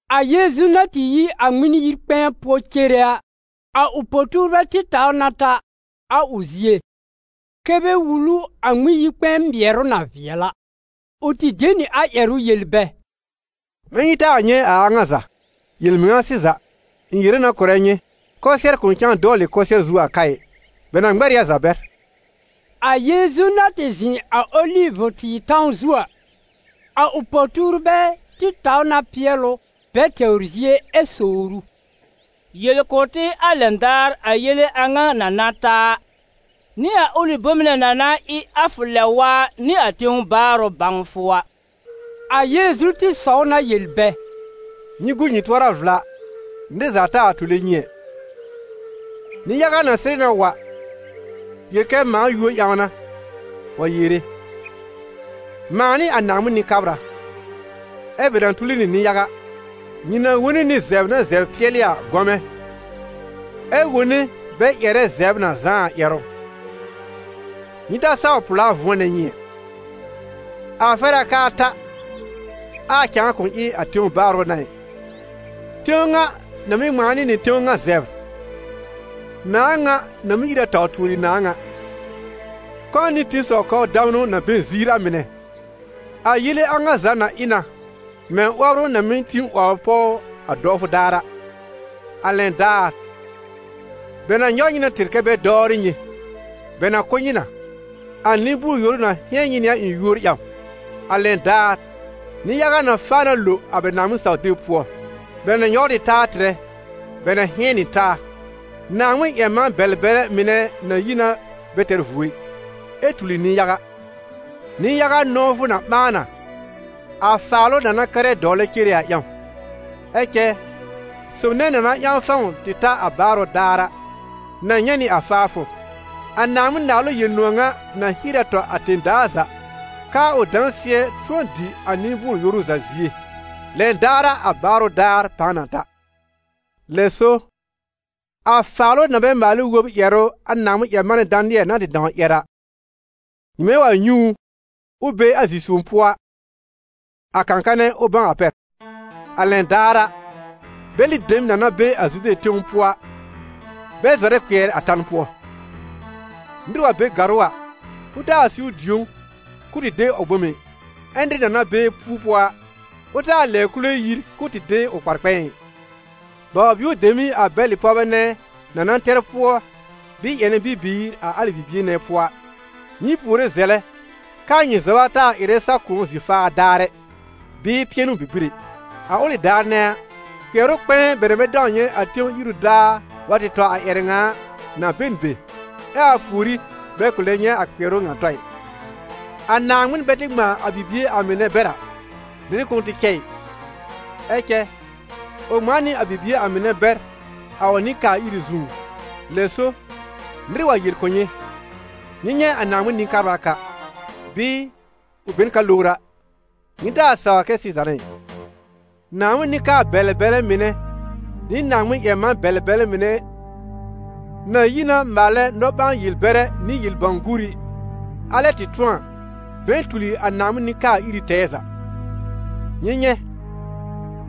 A Yeezu na tɩ yi a Ŋmɩn-yi-kpɛ̃ɛ pʋɔ cere a, a ʋ po-tuurbɛ tɩ taw na ta a ʋ zie, kɛ́ bɛ wul ʋ a Ŋmɩn-yi-kpɛ̃ɛ mɩɛrʋ na vɩɛl a. Ʋ tɩ de nɩ a ƴɛrʋ yel bɛ: «Mɛ̃ nyɩ taa nyɛ̃ a a ŋa za? Yel-mɩŋa sɩza, ɩ̃ yere na kʋ̀rɛ nyɩ, kʋsɩɛr kʋ̃ cãa dɔwlɩ kʋsɩɛr zu a ka ɩ: bɛ na ŋmɛr ɩ a za bɛr.» A Yeezu na tɩ zɩ̃ a Olivʋ-tɩɩr tãw zu a, a ʋ po-tuurbɛ tɩ taw na pɩɛl ʋ bɛ tɛwr zie ɛ sowr ʋ: «Yel kʋ̀ tɩ a lɛn daar a yele a ŋa na na ta a, nɩ a ʋlɩ bom nɛ na na ɩ a fʋ lɛb-waa nɩ a tẽw baarʋ bãwfʋ a.» A Yeezu tɩ sɔw na yel bɛ: «Nyɩ gu nyɩ tʋɔra vla nɩr za taa wa tule nyɩ ɛ. Nɩ-yaga na sɩrɩ na wa, yel kɛ a mãa yúor ƴãw n'a, wa yere: ‹Mãa n'ɩ a Naaŋmɩn Nɩ-kabra›, ɛ bɛ na tuli nɩ nɩ-yaga. Nyɩ na wone nɩ zɛbr na zɛbr pɩɛlɩ a gɔmɛ̃, ɛ wone bɛ ƴɛrɛ zɛbr na zãá a ƴɛrʋ. Nyɩ ta saw pʋ̀lá vʋ̃ɔnɛ nyɩ ɛ; a fɛr a k'aa ta, ɛ cɛ a cãa kʋ̃ ɩ a tẽw baarʋ n'a ɩ; tẽw ŋa na mɩ́ ŋmãa nɩ nɩ tẽw ŋa zɛbr, nãà ŋa na mɩ́ ír a taw tuori nãà ŋa; kɔ̃ nɩ tẽsɔw kɔbr damnʋ na be n ziir a mɩnɛ. A yele a ŋa za na ɩ na mɛ̃ 'wɔbrʋ na mɩ́ tĩ 'wɔbr pɔw a dɔwfʋ daar a. A lɛn daar, bɛ na nyɔw nyɩ na tɩr kɛ́ bɛ dɔwrɩ nyɩ, bɛ na kʋ́ nyɩ na. A nɩ-bʋʋr-yoru na hɩ̃ɛn nyɩ nɩ a ɩ̃ yúor ƴãw A lɛn daar, nɩ-yaga na faa na lo a bɛ Naaŋmɩn-saw-deb pʋɔ; bɛ na nyɔwr ɩ taa tɩrɛ, bɛ na hɩ̃ɛn nɩ taa. Naaŋmɩn-ƴɛr-man-bɛlɛ-bɛlɛ mɩnɛ na yi na bɛ tɛr vuo ɩ, ɛ tuli nɩ-yaga. Nɩ-yaga nɔ̃wfʋ na ɓãa na, a faalʋ na na kɛrɛ dɔwlɛ cere a ƴãw. Ɛ cɛ sob nɛ na na ƴãw fãw tɩ ta a baarʋ daar a, na nyɛ̃ nɩ a faafʋ. A Naaŋmɩn-Naalʋ Yel-nʋ̃ɔ̀ ŋa na hier a tɔ a tẽ-daa za, k'aa ʋ dãsɩɛ tʋ̃ɔ dɩ a nɩ-bʋʋr-yoru za zie. Lɛn daar a, a baarʋ daar pãa na ta.» «Lɛ so, a Faalʋ-na-bɛ-maal-ɩ-wob ƴɛrʋ a Naaŋmɩn-ƴɛr-manɛ Danɩɛl na tɩ dãw ƴɛr a, nyɩmɛ wa nyɛ̃ ʋ, ʋ be a zi-sõw pʋɔ a, a kã-kanɛ, ʋ bãw a pɛr. A lɛn daar a, bɛlɩ dem na na be a Zude tẽw pʋɔ a, bɛ zɔrɛ kpɩɛr a tan pʋɔ. Nɩr wa be gàrʋ́ a, ʋ taa siwr dĩ̀ó k'ʋʋ tɩ de ʋ bome ɩ. Ɛ nɩr na na be pu-pʋɔ a, ʋ taa lɛbr kule yir k'ʋʋ tɩ de ʋ kpar-kpɛ̃ɛ ɩ. Baw-bio dem ɩ a bɛlɩ pɔwbɛ nɛ na na tɛr pʋɔ bɩɩ ƴɛnɛ bibiir a alɩ bibie nɛ pʋɔ a! Nyɩ puore zɛlɛ k'aa nyɩ zɔba taa wa ɩrɛ sa-kʋ̃ɔ zi-faa daar ɛ, bɩɩ pɩɛnʋ-bibir ɛ. A ʋlɩ daar nɛ a, kpɩɛrʋ kpɛ̃ɛ bɛ na bɛ dãw nyɛ̃ a tẽw iru daar wa tɔ a ƴɛrɛ ŋa a, na be n be, ɛ a pùorí bɛ kʋ̃ lɛ nyɛ̃ a kpɩɛrʋ ŋa tɔ ɩ. A Naaŋmɩn bɛ tɩ ŋmãa a bibie a mɩnɛ bɛr a, nɩr kʋ̃ʋ tɩ cɛ ɩ; ɛ cɛ ʋ ŋmãa nɩ a bibie a mɩnɛ bɛr a ʋ nɩ-kaa-iri zũú. Lɛ so, nɩr wa yel kʋ̀ nyɩ: ‹Nyɩ nyɛ̃ a Naaŋmɩn Nɩ-kabra ka›, bɩɩ: ‹Ʋ be n ka lowr a›, nyɩ taa sawr kɛ sɩza n'a ɩ. Naaŋmɩn nɩ-kabr-bɛlɛ-bɛlɛ mɩnɛ nɩ Naaŋmɩn-ƴɛr-man-bɛlɛ-bɛlɛ mɩnɛ na yi na maalɛ nɔ-ɓãa-yel-bɛrɛ nɩ yel-bãw-guuri, alɛ tɩ tʋ̃ɔ a, bɛ̃ɛ tuli a Naaŋmɩn nɩ-kaa-iri tɛɛ za. Nyɩ nyɛ̃,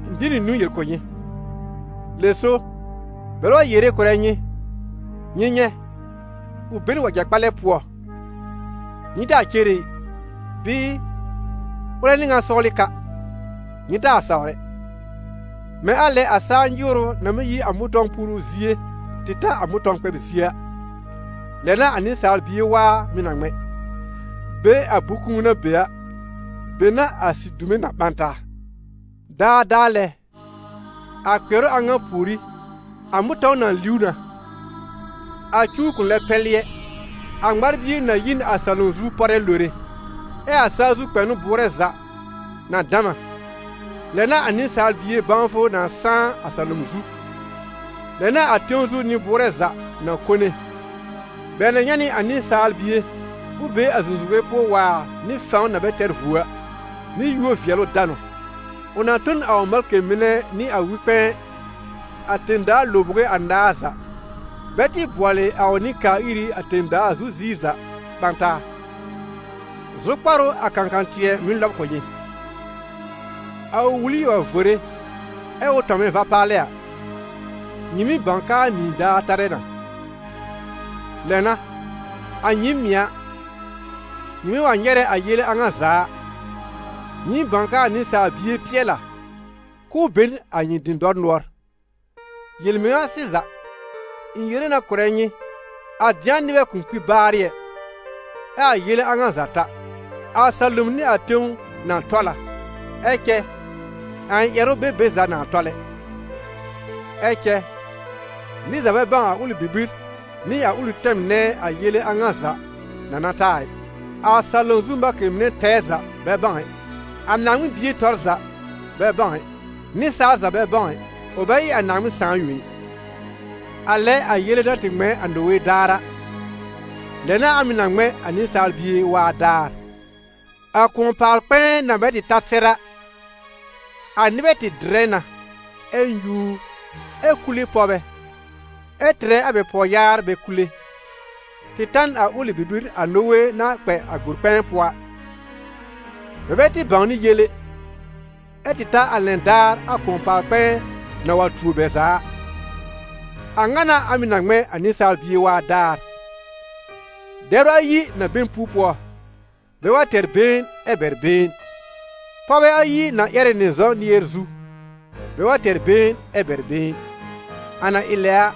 ɩ̃ de nɩ niwn yel kʋ̀ nyɩ. Lɛ so, bɛlɛ wa yere kʋ̀rɛ nyɩ: ‹Nyɩ nyɛ̃, ʋ be n wɛja-kpalɛ pʋɔ›, nyɩ taa cere ɩ; bɩɩ: ‹Ʋlɛ n'ɩ ŋan sɔwlɩ ka›, nyɩ taa sawr ɛ. Mɛ̃ a lɛ a saa nyɩwrʋ na mɩ́ yi a mʋ̃tɔ̃w puru zie tɩ ta a mʋ̃tɔ̃w kpɛb zie a, lɛ n'a a Nɩsaal Bie waa mɩ̀ na ŋmɛ̃. Be a bʋ̃-kũu na be a, be n'a a sidume na ɓã taa.» «Daadaa lɛ, a kpɩɛrʋ a ŋa pùorí, a mʋ̃tɔ̃w na liw na, a cuw kʋ̃ lɛ pɛlɩ ɛ, a ŋmar-bie na yi n a salom zu pɔrɛ lore, ɛ a saa zu kpɛnʋ bʋʋrɛ za na dam a. Lɛ n'a a Nɩsaal Bie bãwfʋ na sãá a salom zu; lɛ n'a a tẽw zu nɩ-bʋʋrɛ za na kone; bɛ na nyɛ̃ nɩ a Nɩsaal Bie ʋ be a zũzuge pʋɔ waar nɩ fãw na bɛ tɛr vuo a, nɩ yúor-vɩɛlʋ-danʋ. Ʋ na tõ n a ʋ malkɩ mɩnɛ nɩ a wɩ-kpɛ̃ɛ a tẽ-daa lõbowe anaar za, bɛ tɩ bʋɔlɩ a ʋ nɩ-kaa-iri a tẽ-daa zu ziir za ɓã taa.» «Zʋkpar ʋ a kãkã-tɩɛ mɩ́ lɔb kʋ̀ nyɩ: a ʋ wuli wa vore ɛ ʋ tɔmnɛ va-palɛ a, nyɩ mɩ́ bãw k'aa nyĩi daar tarɛ na. Lɛ n'a, a nyɩɩm mɩ̀ a, nyɩmɛ wa nyɛrɛ a yele a ŋa za a, nyɩɩm bãw k'aa Nɩsaal Bie pɩɛl a, k'ʋʋ be n a nyɩ dɩ̃dɔr nʋɔr. Yel-mɩŋa sɩza, ɩ̃ yere na kʋ̀rɛ nyɩ, a dɩ̃a nɩbɛ kʋ̃ kpi baarɩ ɛ, ɛ a yele a ŋa za ta. A salom nɩ a tẽw na tɔl a, ɛ cɛ a ɩ̃ ƴɛrʋ bɛ be za na tɔl ɛ.» «Ɛ cɛ nɩr za bɛ bãw a ʋlɩ bibir nɩ a ʋlɩ tɛm nɛ a yele a ŋa za na na ta a ɩ: a salom zu malkɩ mɩnɛ tɛɛ za bɛ bãw ɛ, a Naaŋmɩn Bie tɔr za bɛ bãw ɛ, nɩsaal za bɛ bãw ɛ, ʋ bɛ ɩ a Naaŋmɩn Sãà yõ ɩ. A lɛ a yele na tɩ ŋmɛ̃ a Nowe daar a, lɛ n'a a mɩ̀ na ŋmɛ̃ a Nɩsaal Bie waa daar. A kʋ̃ɔ-paal-kpɛ̃ɛ na bɛ tɩ ta sɛr a, a nɩbɛ tɩ dɩrɛ na, ɛ nyúur, ɛ kule pɔwbɛ, ɛ tɩrɛ a bɛ pɔwyaar bɛ kule, tɩ ta n a ʋlɩ bibir a Nowe na kpɛ a gbor-kpɛ̃ɛ pʋɔ a; bɛ bɛ tɩ bãwnɩ yel ɛ, ɛ tɩ ta a lɛn daar a kʋ̃ɔ-paal-kpɛ̃ɛ na wa tuo bɛ za a. A ŋa n'a a mɩ̀ na ŋmɛ̃ a Nɩsaal Bie waa daar. Dɛbr ayi na be n pu-pʋɔ, bɛ wa tɛr been ɛ bɛr been. Pɔwbɛ ayi na ƴɛrɛ nɩ zɔ̃ nɩɛr zu, bɛ wa tɛr been ɛ bɛr been. A na ɩ lɛ a,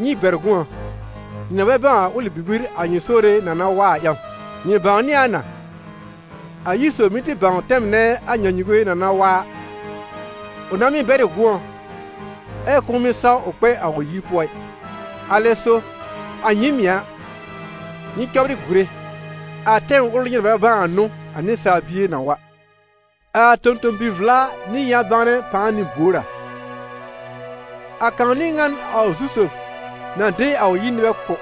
nyɩ bɛr gʋ̃ɔ, nyɩ na bɛ bãw a ʋlɩ bibir a nyɩ Sore na na wa a ƴãw. Nyɩ bãwnɩ a na, a yir sob mɩ́ tɩ bãw tɛm nɛ a nyãnyuwe na na wa a, ʋ nãá mɩ́ bɛr ɩ gʋ̃ɔ, ɛ kʋ̃ʋ mɩ́ saw ʋ kpɛ a ʋ yir pʋɔ ɩ. Alɛ so, a nyɩɩm mɩ̀ a, nyɩ cɔbrɩ gùre, a tɛm ʋl nyɩ na bɛ bãw a n'ʋ a Nɩsaal Bie na wa.» «A tõ-tõ-bi-vla nɩ yã-bãwnɛ pãa n'ɩ buor a? A kãw n'ɩ ŋan a ʋ zu-sob na de a ʋ yir nɩbɛ kʋ̀,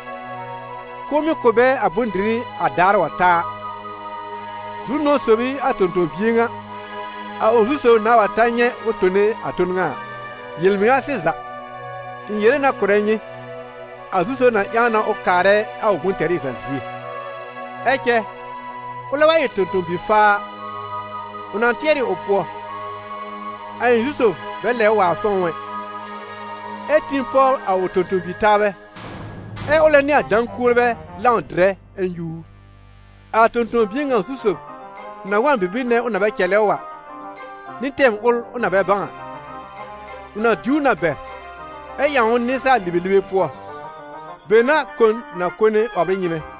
k'ʋʋ mɩ́ kʋ̀ bɛ a bʋ̃-dɩrɩ a daar wa ta a. Zu-nʋ̃ɔ̀ sob ɩ a tõ-tõ-bie ŋa, a ʋ zu-sob nãá wa ta nyɛ̃ ʋ tone a ton ŋa a. Yel-mɩŋa sɩza, ɩ̃ yere na kʋ̀rɛ nyɩ, a zu-sob na ƴãw na ʋ kaarɛ a ʋ bʋ̃-tɛrɩ za zie. Ɛ cɛ ʋlɛ wa ɩ tõ-tõ-bi-faa a, ʋ na tɩɛr ɩ ʋ pʋɔ: ‹A ɩ̃ zu-sob bɛ lɛbr waar fɔ̃w ɛ›, ɛ tĩ pɔbr a ʋ tõ-tõ-bi-taabɛ, ɛ ʋlɛ nɩ a dã-kuolbɛ lãw dɩrɛ ɛ nyúur. A tõ-tõ-bie ŋa zu-sob na wa n bibir nɛ ʋ na bɛ cɛlɛ ʋ a, nɩ tɛm ʋl ʋ na bɛ bãw a. Ʋ na diw ʋ na bɛr, ɛ ƴãw ʋ nɩsaal-libelibe pʋɔ; be n'a kon na kone 'wɔbr ɩ nyɩ́mɛ́.»